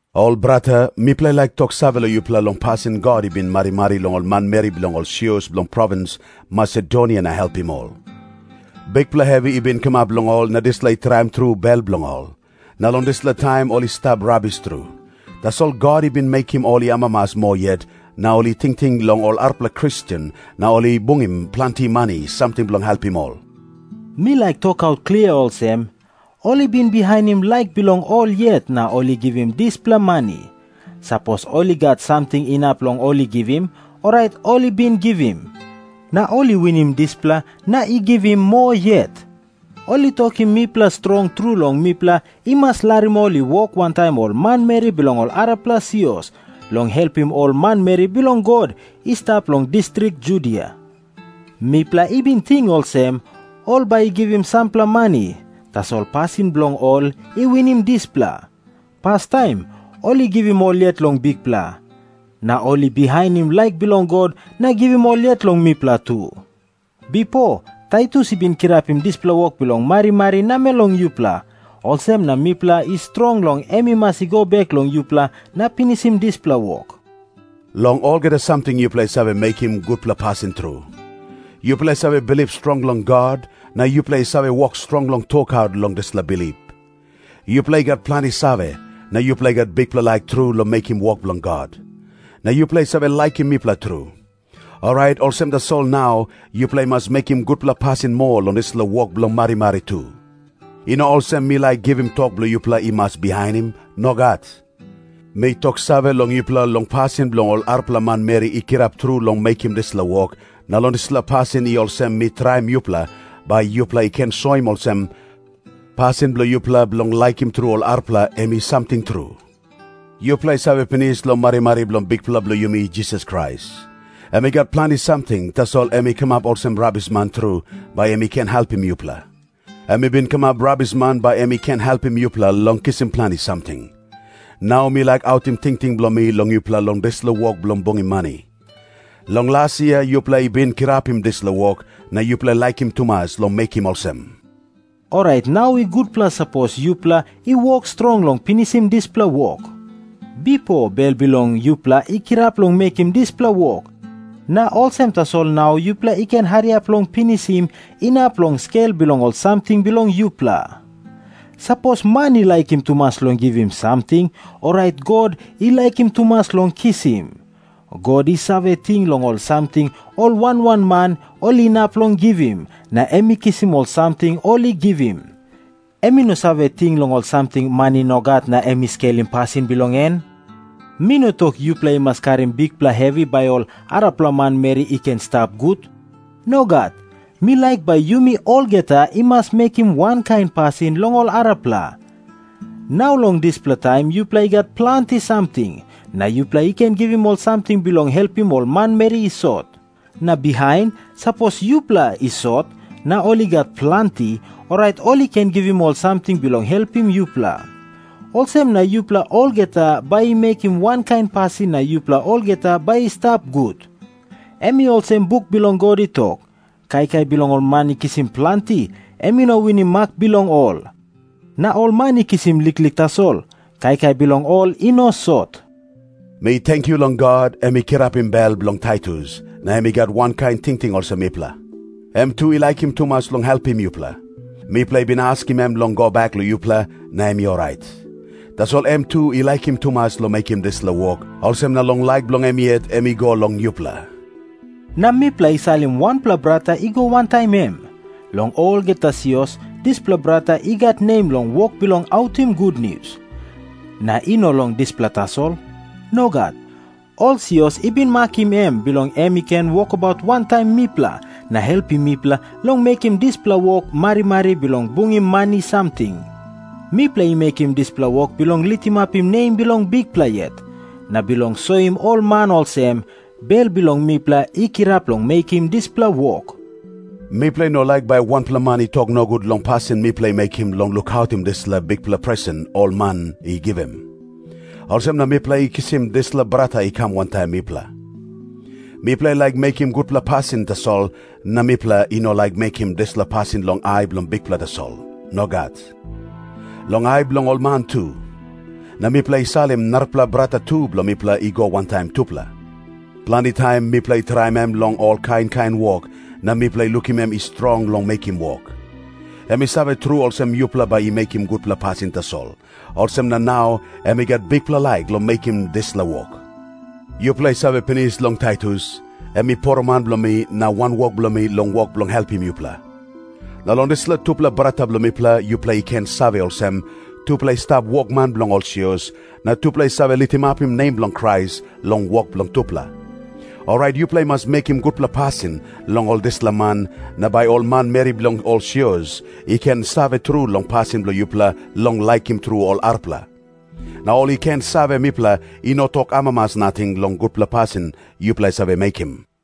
Ol brata, mipela i laik toksave long yupela long pasin God i bin marimari long ol manmeri bilong ol sios bilong provins Masedonia na helpim ol. Bikpela hevi i bin kamap long ol na dispela i traim tru bel bilong ol. Na long dispela taim ol i stap rabis tru. Tasol God i bin mekim ol i amamas moa yet, na ol i tingting long ol arapela Kristen na ol i bungim planti mani samting bilong helpim ol. Mi laik tokaut klia olsem, ol i bin bihainim laik bilong ol yet na ol i givim dispela mani. Sapos ol i gat samting inap long ol i givim, orait ol i bin givim. Na ol i winim dispela na i givim moa yet. Ol i tokim mipela strong tru long mipela i mas larim ol i wok wantaim ol manmeri bilong ol arapela sios long helpim ol manmeri bilong God i stap long distrik Judia. Mipela i bin ting olsem, ol bai i givim sampela mani. Tasol pasin bilong ol i winim dispela. Pastaim ol i givim ol yet long Bikpela, na ol i bihainim laik bilong God na givim ol yet long mipela tu. Bipo Taitus i bin kirapim dispela wok bilong marimari namel long yupela. Olsem na mipela i strong long em i mas go bek long yupela na pinisim dispela wok. Long olgeta samting yupela i save mekim gutpela pasin tru. Yupela i save bilip strong long God, na yupela i save wok strong long tokaut long dispela bilip. Yupela i gat planti save, na yupela i gat bikpela laik tru long mekim wok bilong God. Na yupela i save laikim mipela tru. Orait olsem tasol nau yupela i mas mekim gutpela pasin moa long dispela wok bilong marimari tu. I no olsem mi laik givim tok bilong yupela i mas bihainim. Nogat. Mi toksave long yupela long pasin bilong ol arapela manmeri i kirap tru long mekim dispela wok, na long dispela pasin i olsem mi traim yupela, bai yupela i ken soim olsem, pasin bilong yupela bilong laikim tru ol arapela, em i samting tru. Yupela i save pinis long marimari bilong Bikpela bilong yumi Jisas Krais. Em i gat planti samting, tasol em i kamap olsem rabisman tru, bai em i ken helpim yupela. Em i bin kamap rabisman bai em i ken helpim yupela long kisim planti samting. Nau mi laik autim tingting bilong mi long yupela long dispela wok bilong bungim mani. Long las yia yupela i kirapim dispela wok, na yupela i laikim tumas long mekim olsem. Orait nau i gutpela sapos yupela i wok strong long pinisim dispela wok. Bipo bel bilong yupela i kirap long mekim dispela wok, na olsem tasol nau yupela i ken hariap long pinisim, inap long skel bilong ol samting bilong yupela. Sapos man i laikim tumas long givim samting, orait God i laikim tumas long kisim. God i save ting long ol samting ol wan wan man ol inap long givim, na em i kisim ol samting ol i givim. Em i no save ting long ol samting man i no gat, na em i skelim pasin bilong en. Mi no tok yupela i mas karim bikpela hevi, bai ol arapela manmeri i ken i stap gut. Nogat. Mi laik bai yumi olgeta i mas mekim wankain pasin long ol arapela. Nau long dispela taim yupela i gat planti samting, na yupela i ken givim ol samting bilong helpim ol manmeri i sot. Na bihain, sapos yupela i sot na ol i gat planti, orait ol i ken givim ol samting bilong helpim yupela. Olsem na yupela olgeta bai i mekim wankain pasin na yupela olgeta bai i stap gut. Em i olsem buk bilong God i tok, “Kaikai bilong ol man i kisim planti, em i no winim mak bilong ol. Na ol man i kisim liklik tasol, kaikai bilong ol i no sot.” Mi tenkyu long God, em i kirapim bel bilong Taitus, na em i gat wankain tingting olsem mipela. Em tu i laikim tumas long helpim yupela. Mipela i bin askim em long go bek long yupela, na em i orait. Tasol em tu i laikim tumas long mekim dispela wok, olsem na long laik bilong em yet em i go long yupela. Na mipela i salim wanpela brata i go wantaim em. Long olgeta sios dispela brata i gat nem long wok bilong autim gutnius. Na i no long dispela tasol. Nogat. Ol sios i bin makim em bilong em i ken wokabaut wantaim mipela na helpim mipela long mekim dispela wok marimari bilong bungim mani samting. Mipela i mekim dispela wok bilong litimapim nem bilong Bikpela yet, na bilong soim ol man olsem, bel bilong mipela i kirap long mekim dispela wok. Mipela i no laik bai wanpela man i tok nogut long pasin mipela i mekim bilong lukautim dispela bikpela presen ol man i givim. Olsem na mipela i kisim dispela brata i kam wantaim mipela. Mipela i laik mekim gutpela pasin tasol, na mipela i no laik mekim dispela pasin long ai bilong Bikpela tasol. Nogat. Long ai bilong ol man tu. Na mipela i salim narapela brata tu bilong mipela i go wantaim tupela. Planti taim mipela i traim em long ol kain kain wok, na mipela i lukim em i strong long mekim wok. Em i save tru olsem yupela bai i mekim gutpela pasin tasol, olsem na nau em i gat bikpela laik long mekim dispela wok. Yupela i save pinis long Taitus. Em i poroman bilong mi na wanwok bilong mi long wok bilong helpim yupela. Na long dispela tupela brata bilong mipela yupela i ken save olsem, tupela i stap wokman bilong ol sios, na tupela i save litimapim nem bilong Krais long wok bilong tupela. Orait yupela i mas mekim gutpela pasin long ol dispela man, na bai ol manmeri bilong ol sios i ken save tru long pasin bilong yupela long laikim tru ol arapela. Na ol i ken save mipela i no tok amamas nating long gutpela pasin yupela i save mekim.